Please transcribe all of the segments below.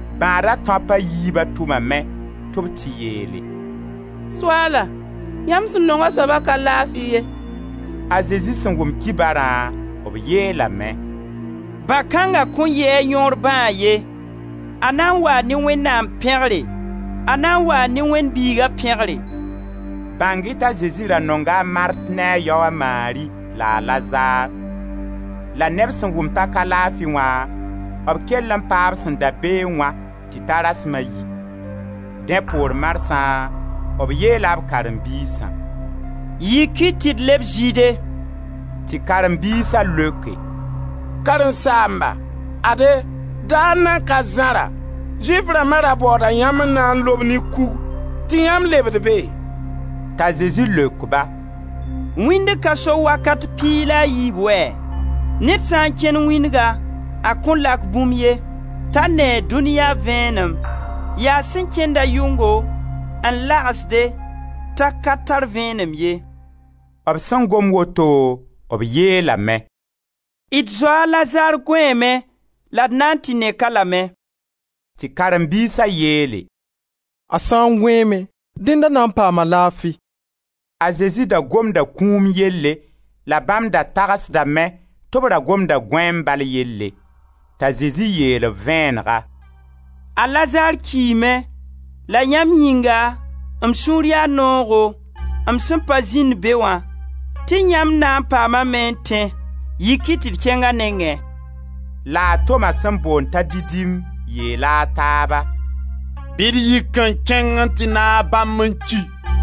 Bãada tãop a yiibã tʋmame tɩ b tɩ yeele: «Soaala, yãmb sẽn nong a soaba ka laafi ye.» A Zezi sẽn wʋm kibarã, b yeelame: «Bã-kãnga kõn yɩ a yõor bãag ye; a na n waa ne Wẽnnaam pẽgre, a na n waa ne Wẽnd Biiga pẽgre.» Bãng-y t'a Zezi ra nonga a Mart ne a yao, a Mari, la a Lazar. La ne b sẽn wʋm t'a ka laafi wã, b kell n paa b sẽn da beẽ wã tɩ ta rasma a yi. Dẽ poor marsã, b yeela b karen-biisã: «Yik-y tɩ d leb Zɩɩde.» Tɩ karen-biisa leoke: «Karen-saamba, ade daar nan ka zãra Zʋɩf rãmba ra baooda yãmb n na n lob ne kug tɩ yãmb lebd be!» T'a Zezi leok-ba: «Wĩndg ka so wakat piig la a yiib wɛ? Ned sã n kẽnd wĩndga a kõn lak bũmb ye, t'a nee dũniya vẽenem, yaa sẽn kẽnd-a yʋngo n lagsde t'a ka tar vẽenem ye.» B sẽn gom woto, b yeelame: «D zoa a Lazar gõeeme la d na n tɩ nek-a lame.» Tɩ karen-biisa yeele: «A sã n gõeeme, dẽnd a na n paama laafi.» A Zezi da gomda kũum yelle la bãmb da tagsdame tɩ b ra gomda gõeem bal yelle. T'a Zezi yeel-b vẽenega: «A Lazar kiime; la yãmb yĩnga m sũur yaa noogo, m sẽn pa zĩnd be wã tɩ yãmb na n paamame n tẽ. Yik-y tɩ d kẽng a nengẽ.» La a Toma sẽn boond t'a Didim yeela a taaba: «Bɩ d yik n kẽng n tɩ naag bãmb n ki!»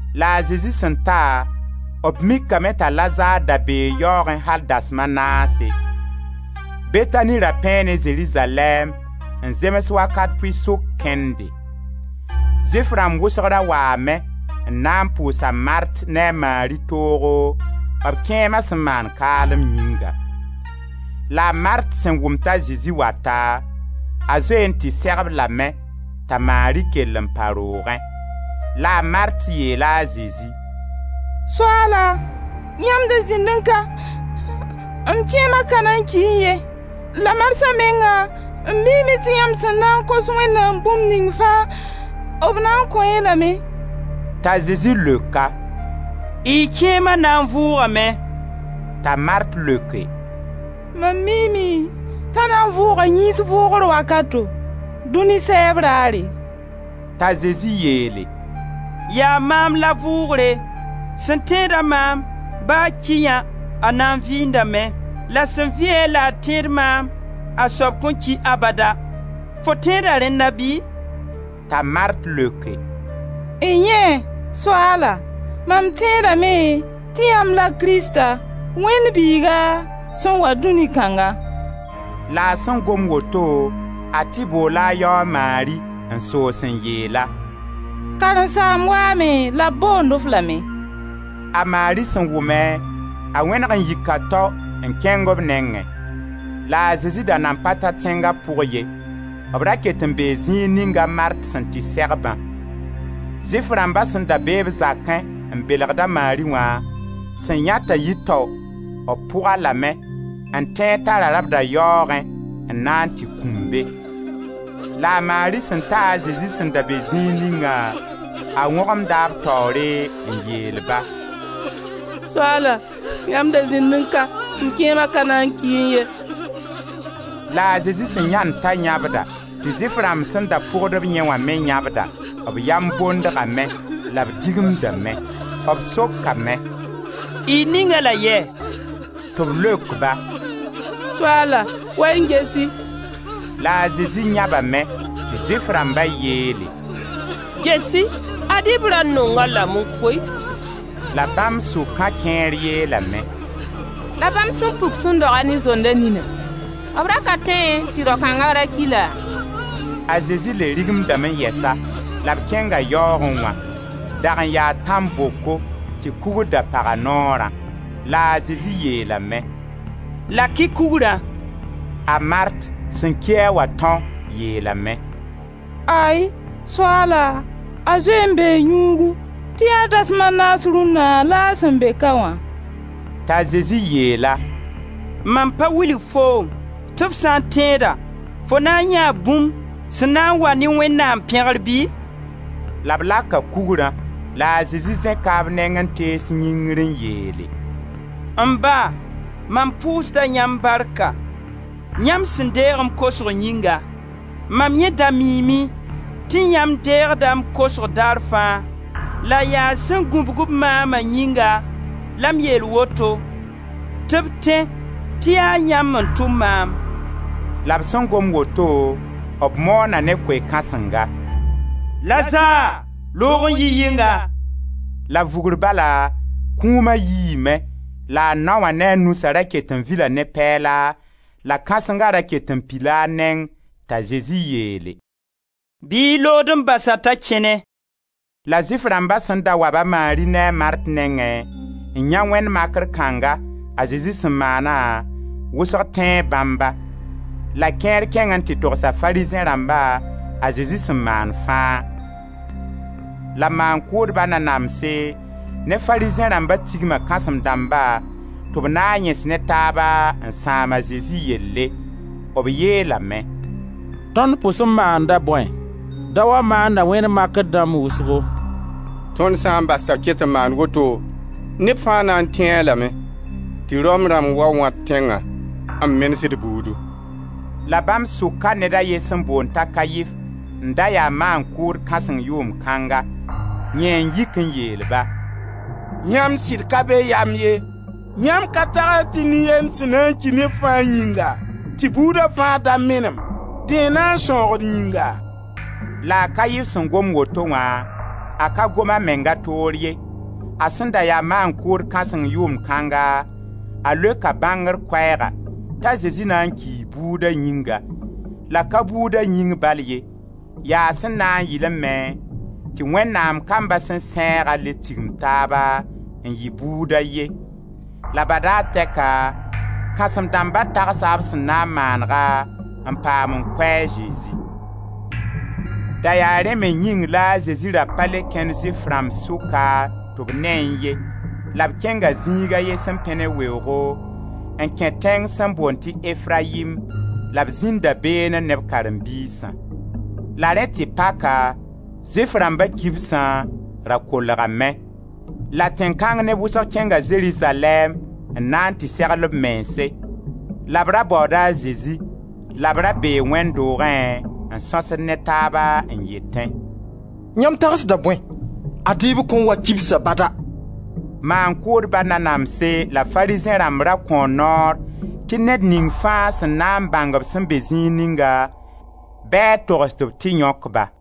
La a Zezi sẽn ta, b mikame t'a Lazar da bee yaoogẽ al dasem a naase. Betani ra pẽe ne Zerizalɛɛm n zems wakat pʋɩ-sʋk kẽnde. Zʋɩf rãmb wʋsg ra waame n na n pʋʋs a Mart ne a Mari toogo, b kẽema sẽn maan kaalem yĩnga. La a Mart sẽn wʋm t'a Zezi wata, a zoe n tɩ seg-b lame, t'a Mari kell n pa roogẽ. La a Mart yeela a Zezi: «Soaala, yãmb da zĩnnẽ ka m kẽema ka na n kiẽ ye. La marsã menga m miime tɩ yãmb sẽn na n kos Wẽnnaam bũmb ning fãa b na n kõ-y lame.» T'a Zezi leok-a: «Y kẽema na n vʋʋgame.» T'a Mart leoke: «Mam miime t'a na n vʋʋga yĩns vʋgr wakato, dũni sɛɛb raare.» T'a Zezi yeele: «Yaa maam la vʋʋgre. Sẽn tẽed-a maam, ba a ki yã, a na n vɩɩndame. La sẽn vɩ-a, la a tẽed maam, a soab kõn ki abada. Fo tẽeda rẽnna bɩ?» T'a Mart leoke: «N-yẽe! Soaala, mam tẽedame, tɩ yãmb la Krista Wẽnd Biiga sẽn wa dũni kãnga.» La a sẽn gom woto a tɩ boola a yao, a Mari, n soos n yeel-a: «Karen-saamb waame la b boond-f lame.» A Mari sẽn wʋme, a wẽneg n yika tao n kẽng b nengẽ. La a Zezi da nan pa ta tẽnga pʋgẽ ye, b ra ket n bee zĩig ninga a Mart sẽn tɩ seg-bã. Zʋɩf rãmba sẽn da be-b zakẽ n belgd a Mari wã, sẽn yãe t'a yii tao, b pʋg-a lame, n tẽed t'a rabda yaoogẽ n na n tɩ kũm be. La a Mari sẽn ta a Zezi sẽn da be zĩig ningã, a wõgemda b taoore n yeel-ba: «Soaala, yãmb da zĩnnẽ ka, m kẽema ka na n kiẽ ye!» La a Zezi sẽn yãend t'a yãbda, tɩ Zʋɩf rãmb sẽn da pʋgd-b yẽ wã me yãbdã, b yam bondgame, la b digimdame. B sokame: «Y ning-a-la yɛ?» Tɩ b leok-ba: «Soaala, wa-y n ges-y!» La a Zezi yãbame. Tɩ Zʋɩf rãmba yeele: «Ges-y! Ad-b ra nong-a lame koe!» La bãmb sʋkã kẽer yeelame: «La bãmb sẽn puk sẽn doga ne zonda nina, b ra ka tõee tɩ rao kãnga ra ki laa?» A Zezi le rigimdame yɛsa la b kẽnga yaoogẽ wã; dag n yaa tãn-boko tɩ kugr da pag a noorã. La a Zezi yeelame: «Lak-y kugrã.» A Mart, sẽn ki-a wã tão, yeelame: «Ay! Soaala, a zoe n bee yũugu, tɩ yaa dasma naas rũnna la a sẽn be ka wã.» T'a Zezi yeel-a: «Mam pa wilg foom tɩ f sã n tẽeda, fo na n yãee bũmb sẽn na n wa ne Wẽnnaam pẽgr bɩ?» La b laka kugrã, la a Zezi zẽka b neng n tees yĩngr n yeele: «M Ba, mam pʋʋsda yãmb barka, yãmb sẽn deeg m kosg yĩnga. Mam yẽ da miime tɩ yãmb deegda m kosg daar fãa, la yaa sẽn gũbg-b maama yĩnga la m yeel woto tɩ b tẽ tɩ yaa yãmb n tʋm maam.» La b sẽn gom woto, b moona ne koe-kãsenga: «Lazar, loog n yi yɩnga!» La vugr bala, kũuma yiime la a nao wã ne a nusã ra ket n vila ne pɛɛla la kãsenga ra ket n pila a neng t'a Zezi yeele: «Bɩ y lood n bas-a t'a kẽne.» La Zʋɩf rãmba sẽn da wa-b a Mari ne a Mart nengẽ, n yãe wẽnd makr kãnga, a Zezi sẽn maana, wʋsg tẽe bãmba. La kẽer kẽng n tɩ togsa Farizẽ rãmba a Zezi sẽn maan fãa. La maan-kʋʋdba nanamse ne Farizẽ rãmba tigma kãsem-dãmba tɩ b na n yẽs ne taaba n sãam a Zezi yelle. B yeelame: «Tõnd pʋs m maanda bõe? Daoã maanda wẽnd makr dãmb wʋsgo. Tõnd sã n bas-a t'a ket n maand woto, neb fãa na n tẽe-a lame, tɩ Rom rãmb wa wã d tẽnga, n menes d buudu.» La bãmb sʋka ned a ye sẽn boond t'a Kaif, n da ya maan-kʋʋd kãseng yʋʋmd kãnga; yẽ n yik n yeel-ba: «Yãmb sɩd ka be yam ye, yãmb ka tagsd tɩ nin-yend sẽn na n ki neb fãa yĩnga, tɩ buuda fãa da menem, dẽ n na n sãoog d yĩnga?» La a Kaif sẽn gom woto wã, a ka gom a menga toor ye. A sẽn da ya maan-kʋʋd kãseng yʋʋmd kãnga, a leoka bãngr koɛɛga, t'a Zezi na n kii buuda yĩnga, la ka buuda yĩng bal ye, yaa sẽn na yɩlẽ me tɩ Wẽnnaam kamba sẽn sẽegã le tigim taaba, n yɩ buud a ye. La badaar tɛka kãsem-dãmba tagsa b sẽn na n maanega n paam n kʋ a Zezi. Da yaa rẽ me yĩng la a Zezi ra pa le kẽnd Zʋɩf rãmb sʋka tɩ b neẽ ye la b kẽnga zĩig a ye sẽn pẽ ne weoogo, n kẽ tẽng sẽn boond tɩ Efrayim la b zĩnda beene ne b karen-biisã. La rẽ tɩ paka, Zʋɩf rãmba kibsã, ra kolgame; la tẽn kãng neb wʋsg kẽnga Zerizalɛɛm n na n tɩ segl b mense, la b ra baooda a Zezi la b ra bee wẽnd doogẽ n sõsd ne taaba n yetẽ: «Yãmb tagsda bõe, ad-y b kõn wa kibsa bada!» Maan-kʋʋdba nanamse la Farizẽ rãmb ra kõo noor tɩ ned ning fãa sẽn na n bãng b sẽn be zĩig ninga, bɩ a togs tɩ b tɩ yõk-ba.